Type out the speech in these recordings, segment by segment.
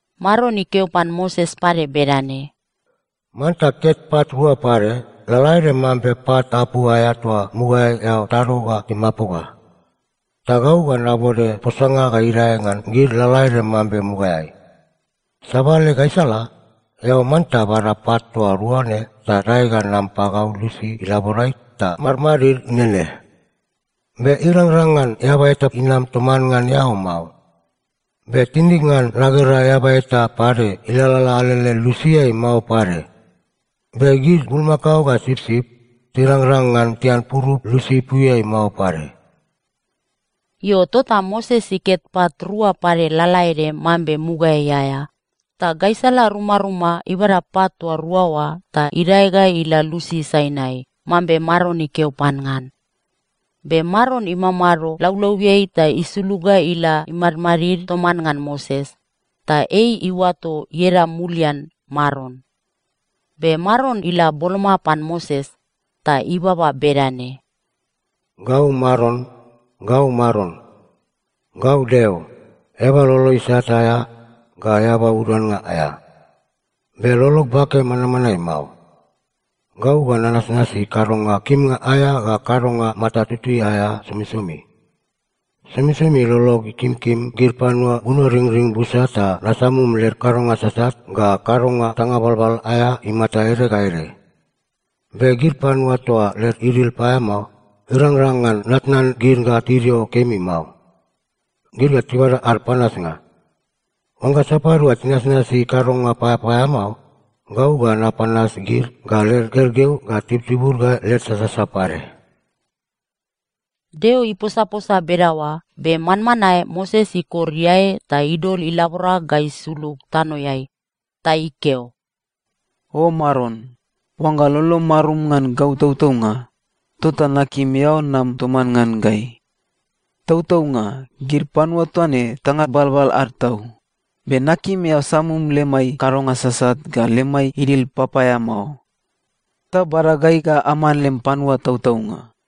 Maron ikeo pan Moses pade bedane, “Manta ket pat rua pade, lalaede mambe pat apu aea toa mugaeai eao tado ga timapoga. Ta gau ga nabode posanga ga idae ngan gid lalaede mambe mugaeai. Sabale gaisala, eao manta bada pat toa rua ne ta dae ga nam pagau lusi ilaborai ta madmadid nene. Be irangrang ngan eaba eta inam toman ngan eao mao. Be tinig ngan nagera eaba eta pade ilalala alele lusiai mao pade. Be gid bulmakao ga sipsip, tirangrang ngan tian purup lusi ipuiai mao pade.” Io, tota Moses iket pat rua pade lalaede mambe mugaeai aea, ta gaisala rumaruma ibada pat toa rua oa ta idae ga ila lusi Sainai, mambe Maron ikeo pan ngan. Be Maron imamado laulauiai ta isulug ga ila imadmadid toman ngan Moses, ta ei iuato ieda mulian Maron. Be Maron ila boloma pan Moses, ta ibaba bedane, “Gau Maron, gau Maron. Gau Deo, eaba lolo isat aea ga eaba uduannga aea. Be lolog bake manmanae mao. Gau ga nanasnasi kadonga kimnga aea ga kadonga mata tutui aea somisomi. Somisomi lolog ikimkim gid panua bunoringring busa ta nasamum led kadonga sasat ga kadonga tanga balbal aea imata ede ga ede. Be gid panua toa led idil paeamao, irangrang ngan natnan gid ga tidio kemi mao. Gid ga tibada ad panasnga. Oangga sapadua tinasnasi kadonga papaeamao, gau ga napanas gid ga led gergeu ga tibutibud ga led sasasa pade.” Deo iposaposa bedaoa, be manmanae Moses ikor iae ta idol ilabora ga isulug tanoeai. Ta ikeo, “O Maron, oangga lolom marum ngan gau tautaunga, tota nakim eao nam toman ngan gai. Tautaunga, gid panua toa ne tanga balbal ad tau, be nakim eao samum lemai kadonga sasat ga lemai idil papaeamao, ta bada gai ga aman lem panua tautaunga.”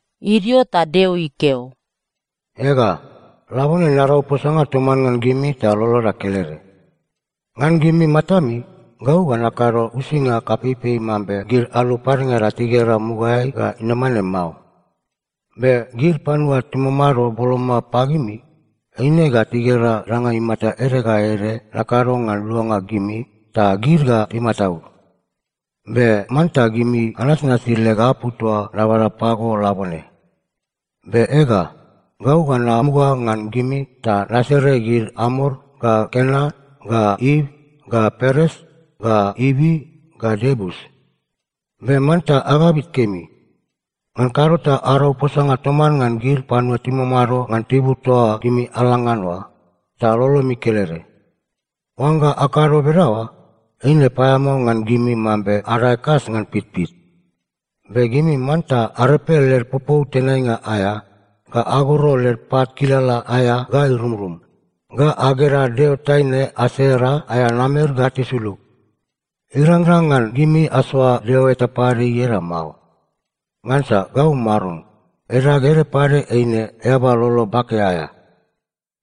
Idio ta Deo ikeo, “Ega, labone narau posanga toman ngan gimi ta loloda kelede. Ngan gimi matami, gau ga nakado uisinga kapeipei mambe gid alu padengada tigera mugaeai ga inama ne mao. Be gid panua timamado boloma pagimi, eine ga tigera danga imata ede ga ede nakado ngan luanga gimi, ta gid ga timataud. Be manta gimi anasnasi leg apu toa nabada pago labone. Be ega, gau ga namuga ngan gimi ta nasere gid Amor ga Kenan ga It ga Peres ga Ivi ga Iebus. Be manta agabit kemi. Ngan kado ta arau posanga toman ngan gid panua timamado ngan tibur toa gimi ala ngan oa, ta lolomi kelede. Oangga akado bedaoa, eine paeamao ngan gimi mambe adae kas ngan pitpit. Be gimi manta arepe led popou tenainga aea, ga agoro led pat kilala aea ga irumrum, ga aged ad deo taine Asera aea namer ga tisulug. Irangrang ngan gimi asoa deo eta pade ieda mao. Ngansa gau Maron, edag ede pade eine Eaba Lolo Bake aea.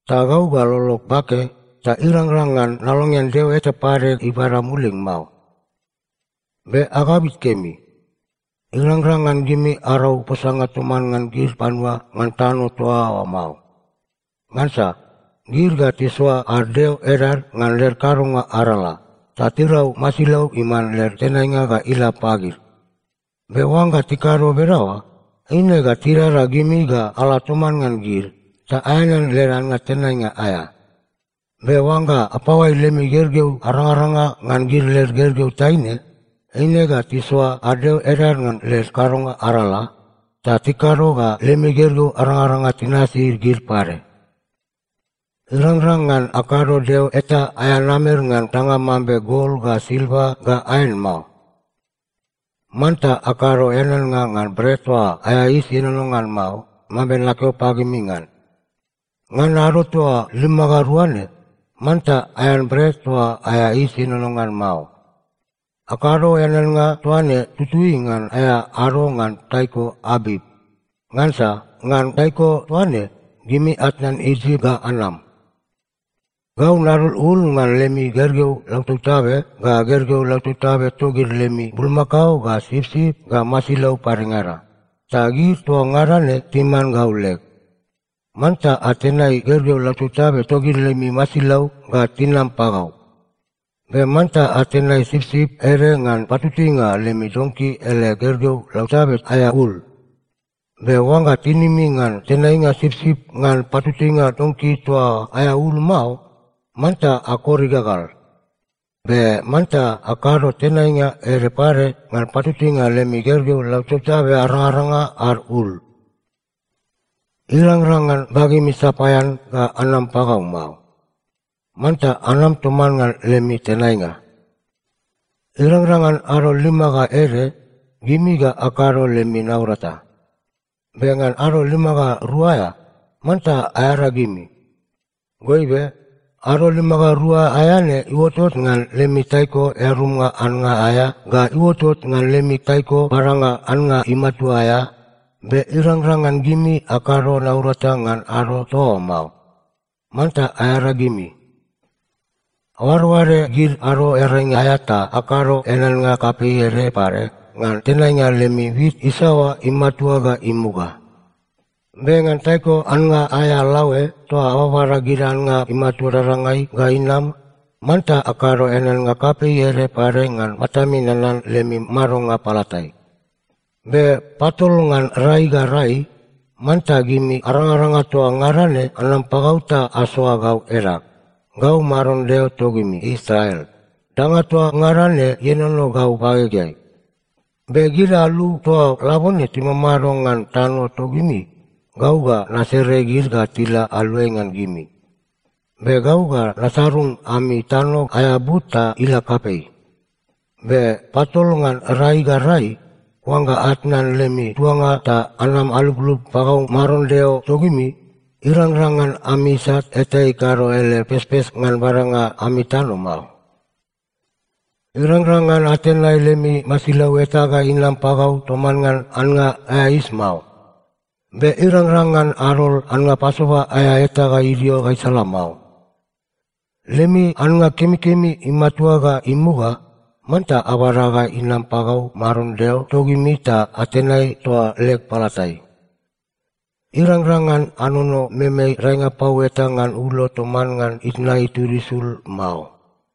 Ta gau ga lolog bake, ta irangrang ngan nalongean deo eta pade ibada mulig mao. “Be agabit kemi. Irangrang ngan gimi arau posanga toman ngan gid panua ngan tano toa oa mao. Ngansa gid ga tisoa ad deo edad ngan led kadonga arala, ta tirau masilau iman led tenainga ga ila pagid. Be oangga tikado bedaoa, eine ga tidada gimi ga ala toman ngan gid, ta aeanean led annga tenainga aea. Be oangga apaoai lemi gergeu arangaranga ngan gid led gergeu taine, eine ga tisoa ad deo edad ngan led kadonga arala, ta tikado ga lemi gergeu arangaranga tinasi gid pade. “Irangrang ngan akado deo eta aea namer ngan danga mambe gol ga silva ga aen mao. “Manta akado eaneannga ngan Bret toa aea Yis Ienono ngan Mao mambe nakeo pagimi ngan. Ngan ado toa lima ga rua ne, manta aean bret toa aea yis ienono ngan mao. Akado eaneannga toa ne tutui ngan aea ado ngan taiko Abip. Ngansa ngan taiko toa ne, gimi atnan Isip ga anam. “Gau nadol ul ngan lemi gergeu lautabtabe ga gergeu lautabtabe togid lemi bulmakao ga sipsip ga masilau padengada, ta gid toa ngada ne timan gau leg. Manta atenai gergeu lautabtabe togid lemi masilau ga tinam pagau. Be manta atenai sipsip ede ngan patutuinga lemi donki ele gergeu lautabe aea ul. Be oangga tinimi ngan tenainga sipsip ngan patutuinga donki toa oa aea ul mao, manta akor igagal. Be manta akado tenainga ede pade ngan patutuinga lemi gergeu lautabtabe arangaranga ad ul. “Irangrang ngan bagemi sapaean ga anam pagau mao. Manta anam toman ngan lemi tenainga. “Irangrang ngan ado lima ga ede, gimi ga akado lemi naurata. Be ngan ado lima ga rua aea, manta aearagimi. Goibe, ado lima ga rua aea ne iuotot ngan lemi taiko earumnga annga aea ga iuotot ngan lemi taiko badanga annga imatua aea, be irangrang ngan gimi akado naurata ngan ado toa oa mao. Manta aearagimi. “Aoadoade gid Ado Earainga aea ta akado eaneannga kapei ede pade ngan tenainga lemi wit isaoa imatua ga imuga. Be ngan taiko annga aea laoe toa ababada gid annga imatua dadangai ga inam, manta akado eaneannga kapei ede pade ngan Matami Nanan lemi Madonga Palatai. Be patol ngan rai ga rai, manta gimi arangaranga toa ngada ne anam pagau ta asoa gau edag. Gau Maron Deo togimi Israel, danga toa ngada ne ienono gau bagegeai. Be gid alu toa labone timamado ngan tano togimi, gau ga nasere gid ga tila aluai ngan gimi. Be gau ga nasarung ami tano aea but ta ila kapei. Be patol ngan rai ga rai, oangga atnan lemi tuanga ta anam aluplup pagau Maron Deo togimi, irangrang ngan ami isat eta ikado ele pespes ngan badanga ami tano mao. “Irangrang ngan atenai lemi masilau eta ga inam pagau toman ngan annga aea yis mao. Be irangrang ngan adol annga Pasova aea eta ga idio gaisala mao. “Lemi annga kemikemi imatua ga imuga, manta abada ga inam pagau Maron Deo togimi ta atenai toa leg palatai. “Irangrang ngan anono meme daenga pau eta ngan ulo toman ngan itna itud isul mao.”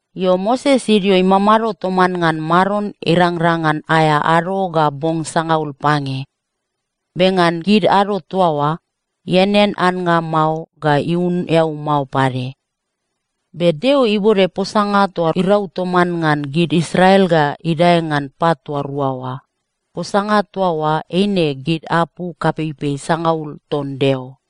Io, Moses idio imamado toman ngan Maron irangrang ngan aea ado ga bong sangaul pange. Be ngan gid ado toa oa, ianean annga mao ga iunun eau mao pade. Be Deo ibode posanga toa irau toman ngan gid Israel ga idae ngan pat toa rua oa. Posanga toa oa eine gid apu kapeipei sangaul ton Deo.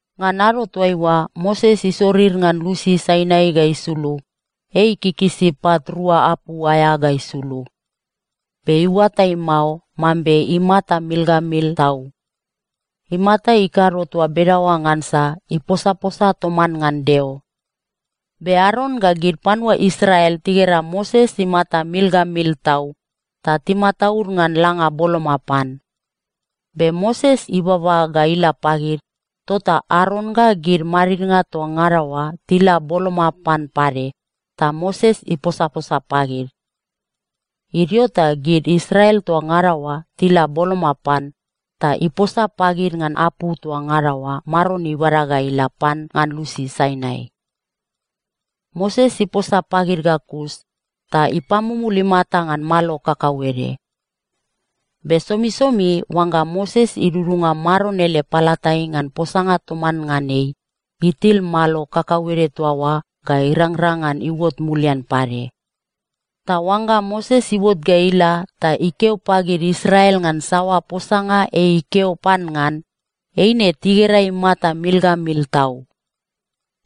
Ngan ado toaiua Moses isorir ngan lusi Sainai ga isulug, ei ikikisi pat rua apu aea ga isulug. Be iuatai mao mambe imata mil ga mil tau. Imata ikado toa bedaoa ngansa iposaposa toman ngan Deo. Be Aron ga gid panua Israel tigera Moses imata mil ga mil tau, ta timataud ngan langa boloma pan. Be Moses ibaba ga ila pagid, tota Aron ga gid madidnga toa ngada oa tila boloma pan pade, ta Moses iposaposa pagid. Idio ta gid Israel toa ngada oa tila boloma pan, ta iposa pagid ngan apu toa ngada oa Maron ibada ga ila pan ngan lusi Sainai. Moses iposa pagid ga kus, ta ipamumul imata ngan malo kakauede. Be somisomi oangga Moses idudunga Maron ele palatai ngan posanga toman ngan ei, itil malo kakauede toa oa ga irangrang ngan iuot mulian pade. Ta oangga Moses iuot ga ila ta ikeo pagid Israel ngan saoa posanga ei ikeo pan ngan, eine tigera imata mil ga mil tau.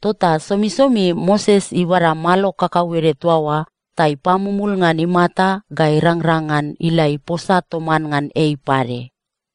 Tota somisomi Moses ibada malo kakauede toa oa ta ipamumul ngan imata ga irangrang ngan ila iposa toman ngan ei pade.